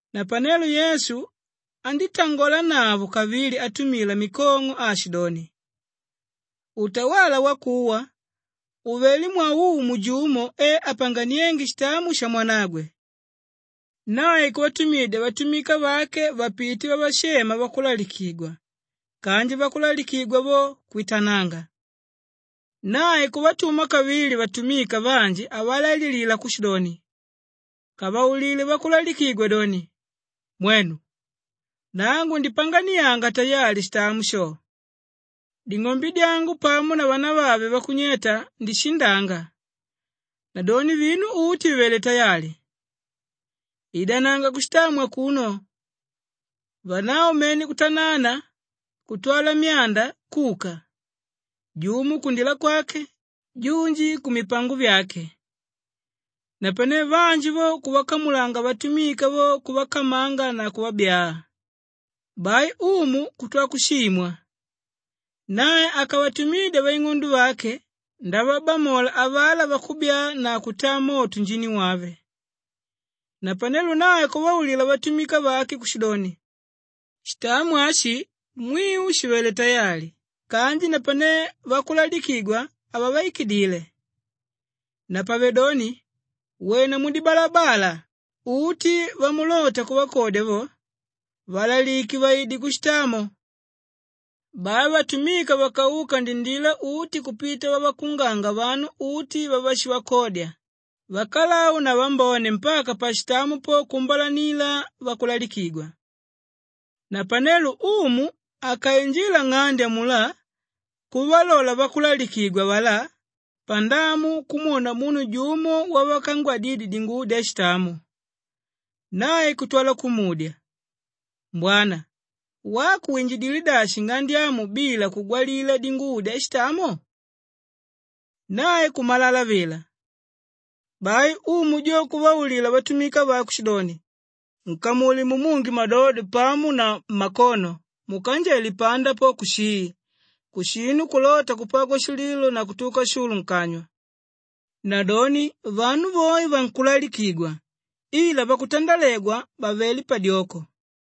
Napanelo Yesu andítangolanavo kavili atumila mikong'o aashidoni, “Utawala wakuwa uvelé mwaumu jumo e apanganiénge shitamo shamwanagwe. Nae kuvatumidya vatumika vake vapite vavashema vakulalikigwa kanji vakulalikigwa vo, kwitananga. “Nae kuvatuma kavili vatumika vanji avalaililila kushidoni, ‘Kavaulile vakulalikigwa doni, “Mwenu! Nangu ndipanganianaga tayali shitamo sho. Ding'ombe dyangu pamo na vanavave vakunyeta, ndishindanga. Nadoni vinu uti vivelé tayali. Idananga kushitamo akuno.” ’ Vanavo mene kutanana kutwa myanda kuka, jumo kundila kwake, junji kumipango vyake. Napane vanji vo kuvakamula vatumika vo kuvakamanga na kuvabyaa. Bai umu kutwala kushimwa. Nae akavatumidya vaing'ondo vake ndavabamola avalá vakubyaa na kutaa moto njini wave. “Napanelo nae kuvaulila vatumika vake kushidoni, ‘Shitamo ashi mwiu shivelé tayali kanji napanelo vakulalikigwa havavaikidile. Napavedoni wena mudibalabala, uti vamulota kuvakodya vo, valalike vaide kushitamo.’ Bai vatumika vakauka ndindila uti kupita vavakunganga vanu uti vavashivakodya, vakalau na vambone mpaka pashitamo po kuumbalanila vakulalikigwa. “Napenelo umu akainjila nng'ande amulá kuvalola vakulalikigwa avalá pandamu kumwona munu jumo wavakangwadidye dinguvo dyashitamo. Nae kutwala kumudya, ‘Mbwana, wako winjidilé dashi nng'ande amu bila kugwalila dinguvo dyashitamo?’ Nae kumalala vila. Bai umu jo kuvaulila vatumika vake kushidoni, ‘Nkamule mumunge mmadodo pamo na mmakono mukanjele panda po kushii! Kushinu kulota kupagwa shililo na kutuka shulu nkanywa.’ Nadoni vanu voe vankulalikigwa ila vakutandalegwa vavelé padyoko.”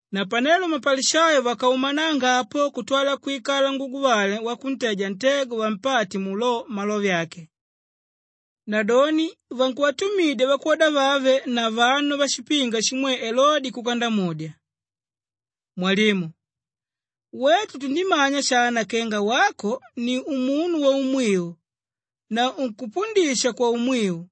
Napanelo mapalishayo vakaumananga apo kutwala kwikala nguguvale wakunteja ntego vampate mu lo malove ake. Nadoni vankuvatumidya vakwoda vave na vanu vashipinga shimwe Elode kuka ndamudya, “Mwalimu, wetu tundimanya shana kenga wako ni umunu waumwiu na unkupundisha kwaumwiu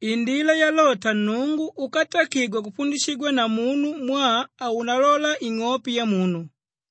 indila yalota Nnungu úkatakigwa kupundishigwa na munu mwaa haunalola ing'ope yamunu.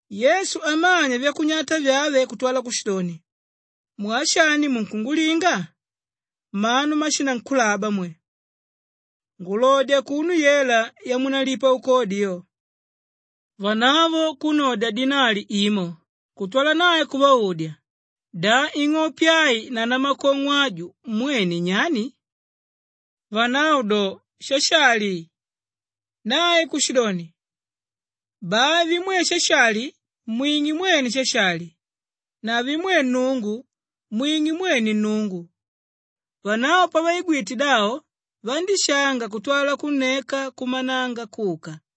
Yesu amanya vyakunyata vyave kutwala kushidoni, “Mwaa shani munkungulinga? Mmanu mmashinankulaba mwe! Ngulodya akuno yela yamunalipa ukodi yo.” Vanavo kunnodya dinali imo kutwala nae kuvaudya, “Da ing'ope ai na namakong'o aju mwene nyani?” Vanavo do, “Shashali!” Nae kushidoni, “Bai vimwe Shashali mwing'e mwene Shashali na vimwe Nnungu mwing'e mwene Nnungu.” Vanavo pavaigwite davo vandíshanga kutwala kunneka kuumananga kuka.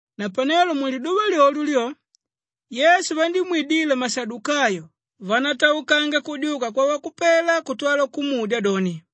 Napanelo muliduva lyolyo lyo Yesu vandímwidila mashadukayo vánataukanga kudyuka kwavakupela kutwala kumudya doni,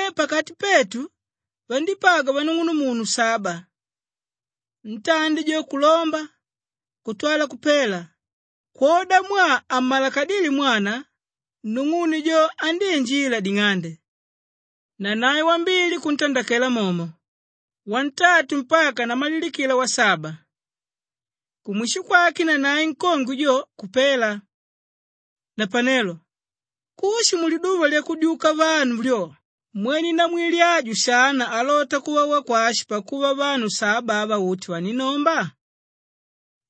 Napanelo pakati petu vandípagwa vanung'unumunu saba. Ntandi jo kulomba kutwala kupela, kwodamwaa hamalakadíle mwana, nung'une jo andíinjila ding'ande. Nanae wambili kuntandakela momo, wantatu mpaka namalilikila wasaba. Kumwisho kwake nanae nkongwe jo kupela. Napanelo kushi muliduva lyakudyuka vanu lyo, mwene namwili aju shana alota kuva wakwashi pakuva vanu saba ava uti vaninnomba?”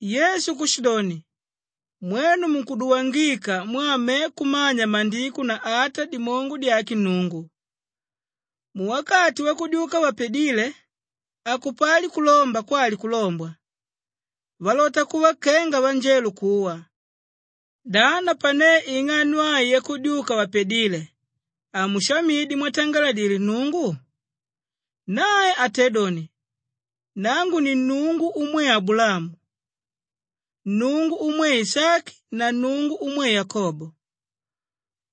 Yesu kushidoni, “Mwenu munkuduwangika mwaa me kumanya Maandiko na ata dimongo dyake Nnungu. Muwakati wakudyuka vapadíle hakupali kulomba kwali kulombwa, valota kuva kenga vanjelo kuwa. Da napane ing'ano ai yakudyuka vapadíle, hamushamidye mwatangaladile Nnungu? Nae atédoni, ‘Nangu ni Nnungu umwe Abulaamu, Nnungu umwe Ishaki na Nnungu umwe Yakobo.’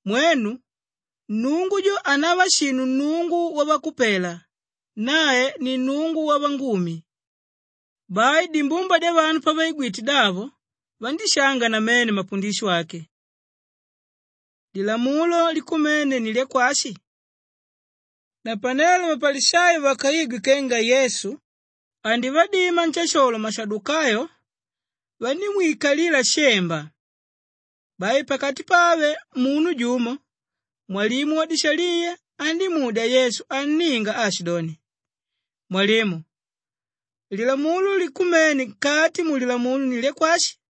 Mwenu, Nnungu jo hanava shinu Nnungu wavakupela, nae ni Nnungu wavangumi.” Bai dimbumba dyavanu pavaigwite davo vandíshanga namene mapundisho ake. Lilamulo likumene ni lyakwashi? Napanelo mapalishayo vakaigwe kenga Yesu andivadima nshasholo mashadukayo, vandímwikalila shemba. Bai pakati pave munu jumo, mwalimu wadishaliya andímudya Yesu anninga aashidoni, “Mwalimu, lilamulo likumene nkati mu Lilamulo ni lyakwashi?”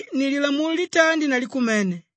Ali ni lilamulo litandi na likumene.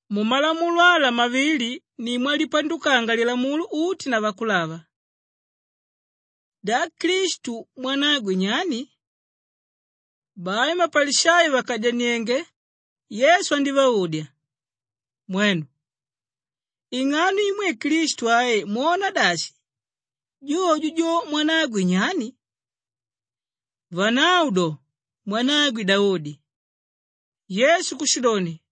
Mumalamulo ala mavila ni mwalipandukanga Lilamulo uti na Vakulava.” Da Klistu mwanagwe nyani? Bai mapalishayo vakadyaniénge, Yesu andívaudya, “Mwenu, ing'ano imwe Klistu ai mwona dashi? Jojo jo mwanagwe nyani?” Vanavo do, “Mwanagwe Daudi.” Yesu kushidoni,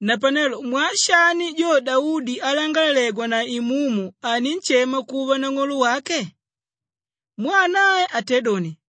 “Napanelo mwaa shani jo Daudi alangalalegwa na Imumu, aninshema kuva nang'olo wake? Kwali: Umu wake. Mwaa nae atédoni,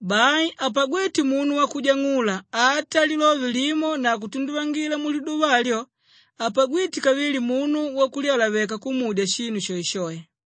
Bai hapagwíte munu wakujang'ula ata lilove limo na kutunduvangila muliduva alyo hapagwíte kavili munu wakulyalaveka kumudya shinu shoeshoe.